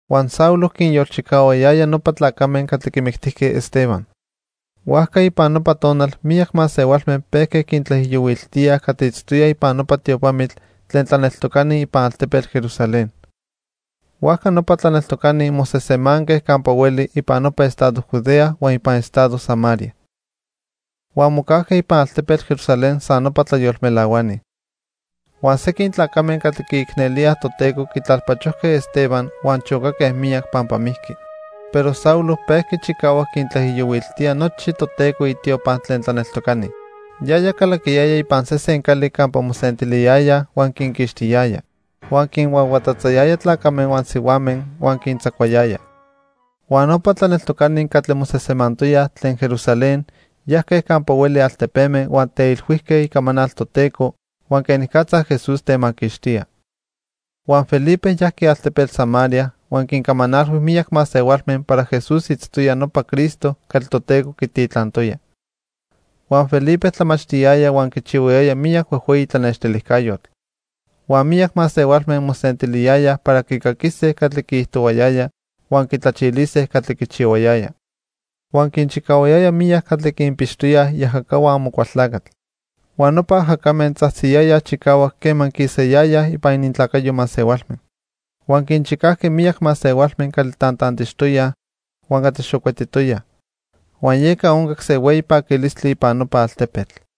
Huan Saulo quinyolchicahuayaya nopa tlacame catli quimictijque Esteban. Huajca ipan nopa tonal miyac masehualme pejque quintlaijiyohuiltíaj catli itztoyaj ipan nopa tiopamitl tlen tlaneltocani ipan altepetl Jerusalén. Huajca nopa tlaneltocani mosejsemanque campa hueli ipan nopa estado Judea huan ipan estado Samaria. Huan mocajque ipan altepetl Jerusalén san nopa tlayolmelahuani. Huan sequin tlacame catli quiicnelíaj Toteco quitlalpachojque Esteban huan chocaque miyac pampa mijqui. Pero Saulo pejqui chicahuac quintlaijiyohuiltía nochi Toteco itiopa tlen tlaneltocani. Yaya calaquiyaya ipan sesen cali campa mosentiliyayaj huan quinquixtiyaya. Huan quinhuahuatatzayaya tlacame huan sihuame huan quintzacuayaya. Huan nopa tlaneltocani catli mosejsemantoyaj tlen Jerusalén, yajque campa hueli altepeme huan teilhuijque icamanal Toteco huan quenicatza Jesús temaquixtía. Huan Felipe yajqui altepetl Samaria huan quincamanalhui miyac masehualme para Jesús itztoya nopa Cristo catli Toteco quititlantoya. Huan Felipe tlamachtiyaya huan quichihuayaya miyac huejhueyi tlanextilijcayotl. Huan miyac masehualme mosentiliyayaj para quicaquise catli quiijtohuayaya huan quitlachilise catli quichihuayaya. Huan quinchicahuayaya miyac catli quinpixtoyaj iajacahua Amocualtlacatl. Huan nopa ajacame tzajtziyayaj chicahuac quema quisayayaj ipan inintlacayo masehualme. Huan quinchicajqui miyac masehualme catli tantantixtoyaj huan catli xocuetitoyaj. Huan yeca oncac se hueyi paquilistli ipan nopa altepetl.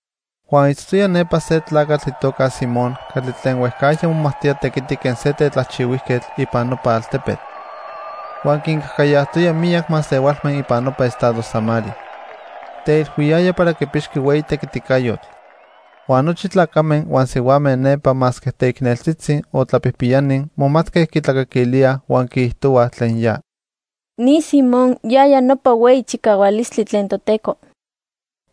Huan itztoya nepa se tlacatl itoca Simón catli tlen huejcajya momajtoya tequiti quen se tetlajchihuijquetl ipan nopa altepetl. Huan quincajcayajtoya miyac masehualme ipan nopa estado Samaria. Teilhuiyaya para quipixqui hueyi tequiticayotl. Huan nochi tlacame huan sihuame nepa masque teicneltzitzi o tlapijpiyani momatque quitlacaquilíaj huan quiijtohuaj tlen ya: "Ni Simón yaya nopa Hueyi Chicahualistli Tlen Toteco."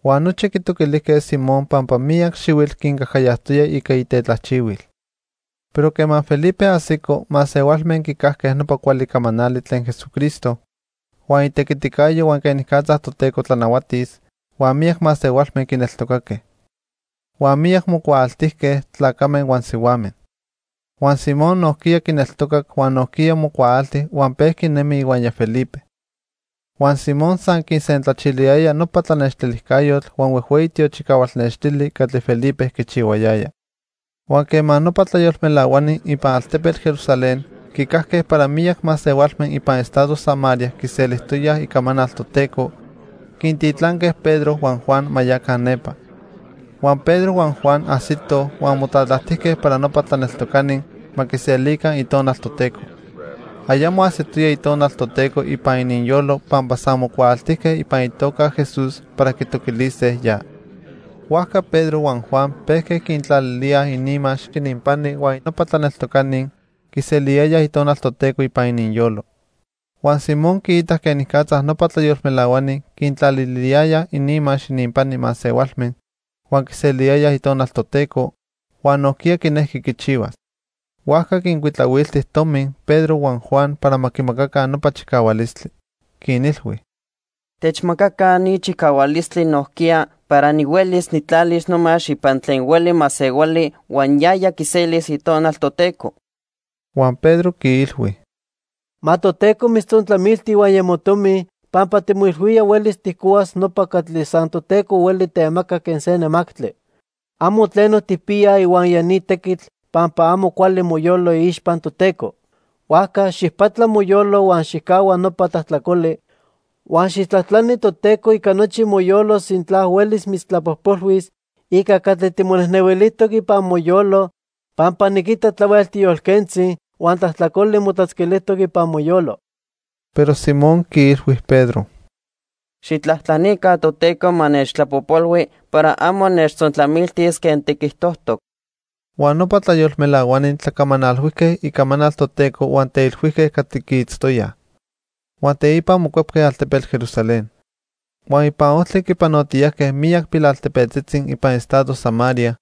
Huan nochi quitoquilijque Simón pampa para miyac xihuitl quincajcayajtoya ica itetlajchihuil. Pero quema Felipe ajsico, masehualme quicajque nopa cuali camanali tlen Jesucristo huan itequiticayo huan quenicatza Toteco tlanahuatis, huan miyac masehualme quineltocaque. Huan miyac mocuaaltijque, tlacame huan sihuame. Huan Simón nojquiya quineltocac huan nojquiya mocuaalti huan pejqui nemi ihuaya Felipe. Huan Simón san quisentlachiliyaya nopa tlanextilijcayotl huan huejhueyi tiochicahual nextili catli Felipe quichihuayaya. Huan quema nopa tlayolmelahuani ipan altepetl Jerusalén quicajque para miyac masehualme ipan estado Samaria quiselijtoyaj icamanal Toteco, quintitlanque Pedro huan Juan ma yaca nepa. Huan Pedro huan Juan ajsitoj huan motlatlajtijque para nopa tlaneltocani ma quiselica Itonal Toteco. Ayamo ajsitoya Itonal Toteco ipan ininyolo pampa san mocuaaltijque ipan itoca Jesús para quitoquilise ya. Huajca Pedro huan Juan pejque quintlalilíaj ininmax ininpani huan nopa tlaneltocani quiseliyayaj Itonal Toteco ipan ininyolo. Huan Simón quiitac quenicatza nopa tlayolmelahuani quintlaliliyayaj ininmax ininpani masehualme huan quiseliyayaj Itonal Toteco, huan nojquiya quinejqui quichihuas. Huajca quincuitlahuilti tomi Pedro huan Juan para ma quimacaca nopa chicahualistli. Quinilhui: —Techmacaca ni chicahualistli nojquiya para nihuelis nijtlalis nomax ipan tlen hueli masehuali huan yaya quiselis Itonal Toteco. Huan Pedro quiilhui: —Ma Toteco mitztzontlamilti ihuaya motomi pampa timoilhuía huelis tijcohuas nopa catli san Toteco hueli temaca quen se nemactli. Amo tleno tijpiya ihuaya ni tequitl pampa amo cuali moyolo iixpa Toteco. Huajca xijpatla moyolo huan xijcahua nopa tlajtlacoli, huan xijtlajtlani Toteco ica nochi moyolo sintla huelis mitztlapojpolhuis ica catli timonejnehuilijtoc ipan moyolo, pampa niquita tlahuel tiyolquentzi, huan tlajtlacoli motlatzquilijtoc ipan moyolo. Pero Simón quiilhui Pedro: —Xijtlajtlanica Toteco ma nechtlapojpolhui para amo nechtzontlamiltis quen tiquijtojtoc. Huan nopa tlayolmelahuani tlacamanalhuijque icamanal Toteco huan teilhuijque catli quiitztoyaj. Huan teipa mocuepque altepetl Jerusalén. Huan ipan ojtli quipanotiyajque miyac pilaltepetzitzi ipan estado Samaria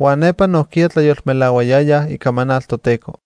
huan nepa nojquiya tlayolmelahuayayaj icamanal Toteco.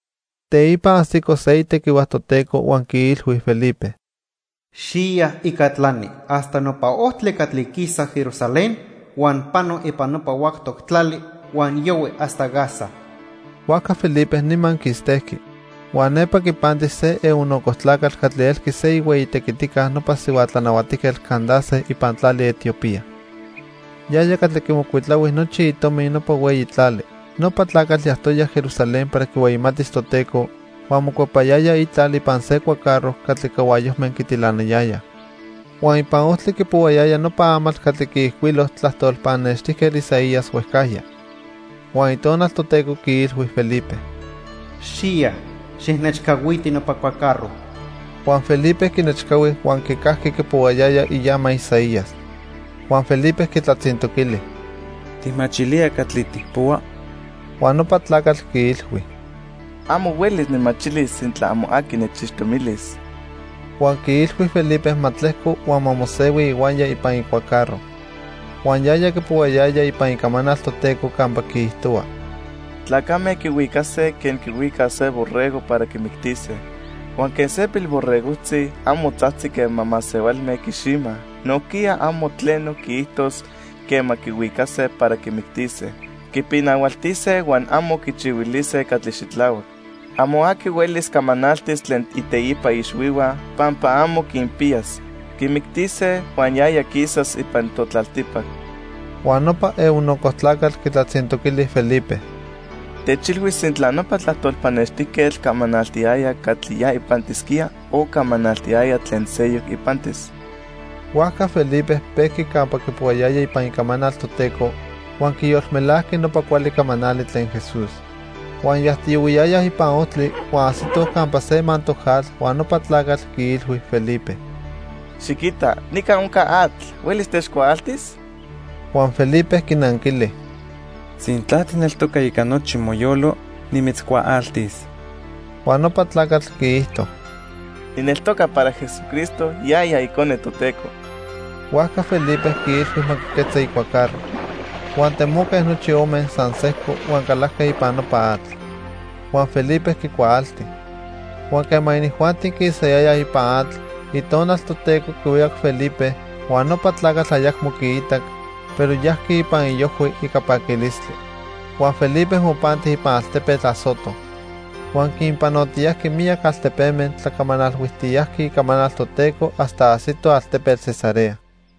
Teipa ajsico se itequihua Toteco huan quiilhui Felipe: "Xiya ica tlani hasta nopa ojtli catli quisa Jerusalén huan pano ipan nopa huactoc tlali huan yohui hasta Gaza." Huajca Felipe nima quistejqui. Huan nepa quipanti se eunuco tlacatl catli elqui se ihueyi tequitica nopa sihua tlanahuatijquetl Candace ipan tlali Etiopía. Yaya catli quimocuitlahui nochi itomi nopa hueyi tlali. Nopa tlacatl yajtoya Jerusalén para quihueyimatis Toteco, huan mocuepayaya itlal ipan se cuacarro catli cahuayojme quitilanayayaj. Huan ipan ojtli quipohuayaya nopa amatl catli quiijcuilo tlajtol pannextijquetl Isaías huejcajya. Huan Itonal Toteco quiilhui Felipe: —Xiya, xijnechcahuiti nopa cuacarro. Huan Felipe quinechcahui huan quicajqui quipohuayaya iama Isaías. Huan Felipe quitlatzintoquili: —¿Tijmachilía catli tijpohua? Huan nopa tlacatl quiilhui: —Amo huelis nijmachilis sintla amo aqui nechixtomilis. Huan quiilhui Felipe ma tlejco huan ma mosehui ihuaya ipan icuacarro. Huan yaya quipohuayaya ipan Icamanal Toteco campa quiijtohua: "Tlacame quihuicase quen quihuicaj se borrego para quimictise. Huan quen se pilborregojtzi amo tzajtzi quema masehualme quiximaj, nojquiya amo tleno quiijtos quema quihuicase para quimictise. Quipinahualtise huan amo quichihuilise catli xitlahuac. Amo aqui huelis camanaltis tlen iteipa ixhuihua, pampa amo quinpiyas. Quimictise huan yaya quisas ipan totlaltipac." Huan nopa eunuco tlacatl quitlatzintoquili Felipe: —Techilhui sintla nopa tlajtol pannextijquetl camanaltiyaya catli ya ipantisquía, o camanaltiyaya tlen seyoc ipantis. Huajca Felipe pejqui campa quipohuayaya ipan Icamanal Toteco huan quiyolmelajqui nopa cuali camanali tlen Jesús. Huan yajtiyohuiyayaj ipan ojtli, huan ajsitoj campa se mantoc atl huan nopa tlacatl quiilhui Felipe: —Xiquita, nica onca atl. ¿Huelis techcuaaltis? Huan Felipe quinanquili: —Sintla tijneltoca ica nochi moyolo, nimitzcuaaltis. Huan nopa tlacatl quiijto: —Nijneltoca para Jesucristo yaya Icone Toteco. Huajca Felipe quiilhui ma quiquetza icuacarro. Huan temoque nochi ome san sejco huan calajque ipan nopa atl. Huan Felipe quicuaalti. Huan quema inijuanti quisayayaj ipan atl, Itonal Toteco quihuicac Felipe, huan nopa tlacatl ayacmo quiitac, pero yajqui ipan iojhui ica paquilistli. Huan Felipe mopanti ipan altepetl Azoto. Huan quinpanotiyajqui miyac altepeme tlacamanalhuijtiyajqui icamanal Toteco hasta ajsito altepetl Cesarea.